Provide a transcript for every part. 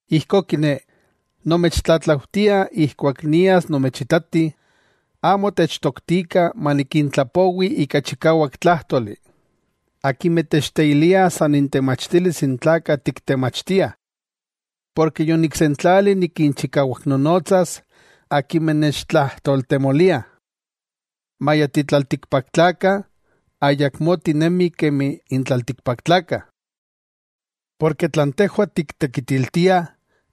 Ijkó kiné, nomechtlatlaujtia ijkuak nias nomechitati, amo techtoktikah manikintlapowi ika chikawak tlájtoli akimeh techteiliah san intemachtilis n tlakah tiktemachtiah. Porke yoniksentlali nikinchikawaknonotsas akimeh nechtlajtoltemoliah. Maya titlaltikpaktlakah, ayakmó tinemih kemi n tlaltikpaktlakah. Porke tlan tejwah tiktekitiltiah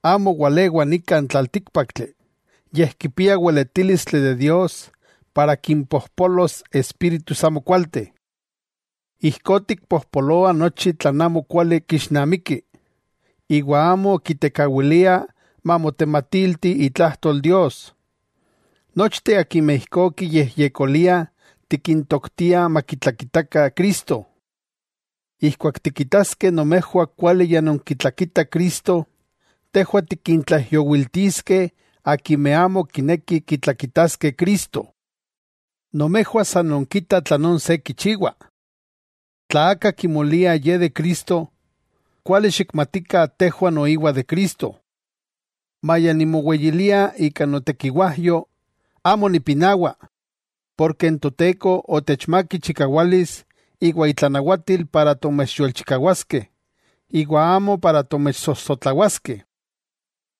amo walewa nika n tlaltíkpaktli, yej kipia weletílistli de Dios para kimpopolos espíritus amokualteh. Ijkó tikpojpoloah nochi tlan amo kuali kixnamiki, iwa amo kitekawilia mamotematilti itlajtol Dios. Nochteh akimeh ijkó kiyejyekoliah tikintoktiah makitlakita Cristo. Ijkuak tikitaskeh nomejwah kuali ya nonkitlakitah Cristo, tejwah tikintlaijyowiltiskeh akimeh amo kinekih kitlakitaskeh Cristo. Nomejwah san nonkitah tlanón se kichiwa. Tla aka kimolia ye de Cristo, kuali xikmatikah tejwah noiwa de Cristo. Maya nimoweyilia ika notekiwajyo, amo nipinawa, porke n Toteko otechmák ichikawalis iwa itlanawatil para tomechyolchikawaskeh iwa amo para tomechsojsotlawaskeh.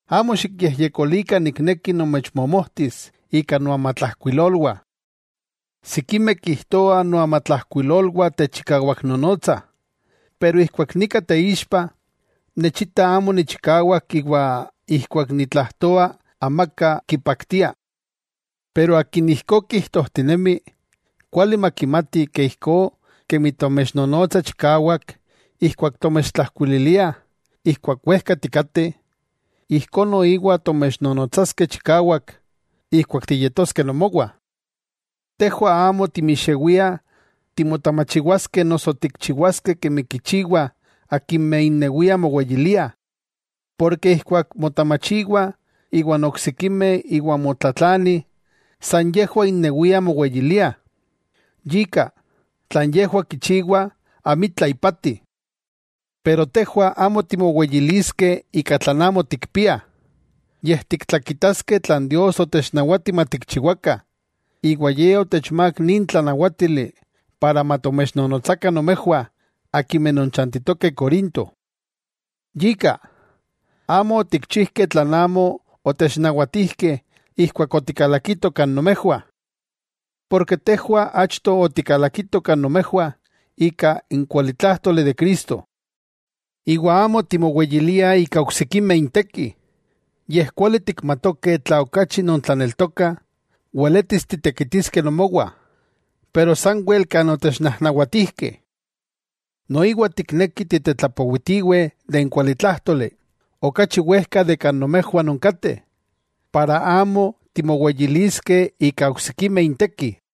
Amo xikyejyekolikah nikneki nomechmomojtis ika noamatlajkuilolwah. Sikimeh kijtoah noamatlajkuilolwah techikawaknonotsah, pero ijkuak nika teixpa, nechita amo nichikawak iwa ijkuak nitlajtoa amaka kipaktia. Pero akin ijkó kijtojtinemi, kuali makimati ke ijkó kemi tomechnonotsah chikawak ijkuak tomechtlajkuililiah ijkuak wejka tikateh, ijkó noiwa tomechnonotsaskeh chikawak ijkuak tiyetoskeh nomowah. Tejwah amo timixewiah timotamachiwaskeh noso tikchiwaskeh kemi kichiwah akimeh innewiah moweyiliah. Porke ijkuak motamachiwah iwan oksikimeh iwa motlatlanih, san yejwah innewiah moweyiliah. Yika, tlan yejwah kichiwah amitla ipati. Pero tejwah amo timoweyiliskeh ika tlan amo tikpiah, yej tiktlakitaskeh tlan Dios otechnawati matikchiwakah, iwa Ye otechmák nin tlanawátili para matomechnonotsakah nomejwah akimeh nonchantitokeh Corinto. Yika, amo otikchijkeh tlan amo otechnawatijkeh ijkuak otikalakitoh kan nomejwah. Porke tejwah achto otikalakitoh kan nomejwah ika n kualitlájtoli de Cristo. Iwa amo timoweyiliah ika oksikimeh inteki. Yej kuali tikmatokeh tla okachi nontlaneltokah, weletis titekitiskeh nomowah, pero sanwel kan otechnajnawatijkeh. Noiwa tiknekih tiktetlapowitiweh n kualitlájtoli, okachi wejka de kan nomejwah nonkateh, iwa amo timoweyiliskeh ika oksikimeh inteki.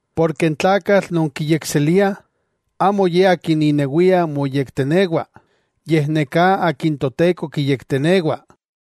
Porke n tlakatl non kiyekseliah, amo ye akin inewia moyektenewa, yej neka akin Toteko kiyektenewa.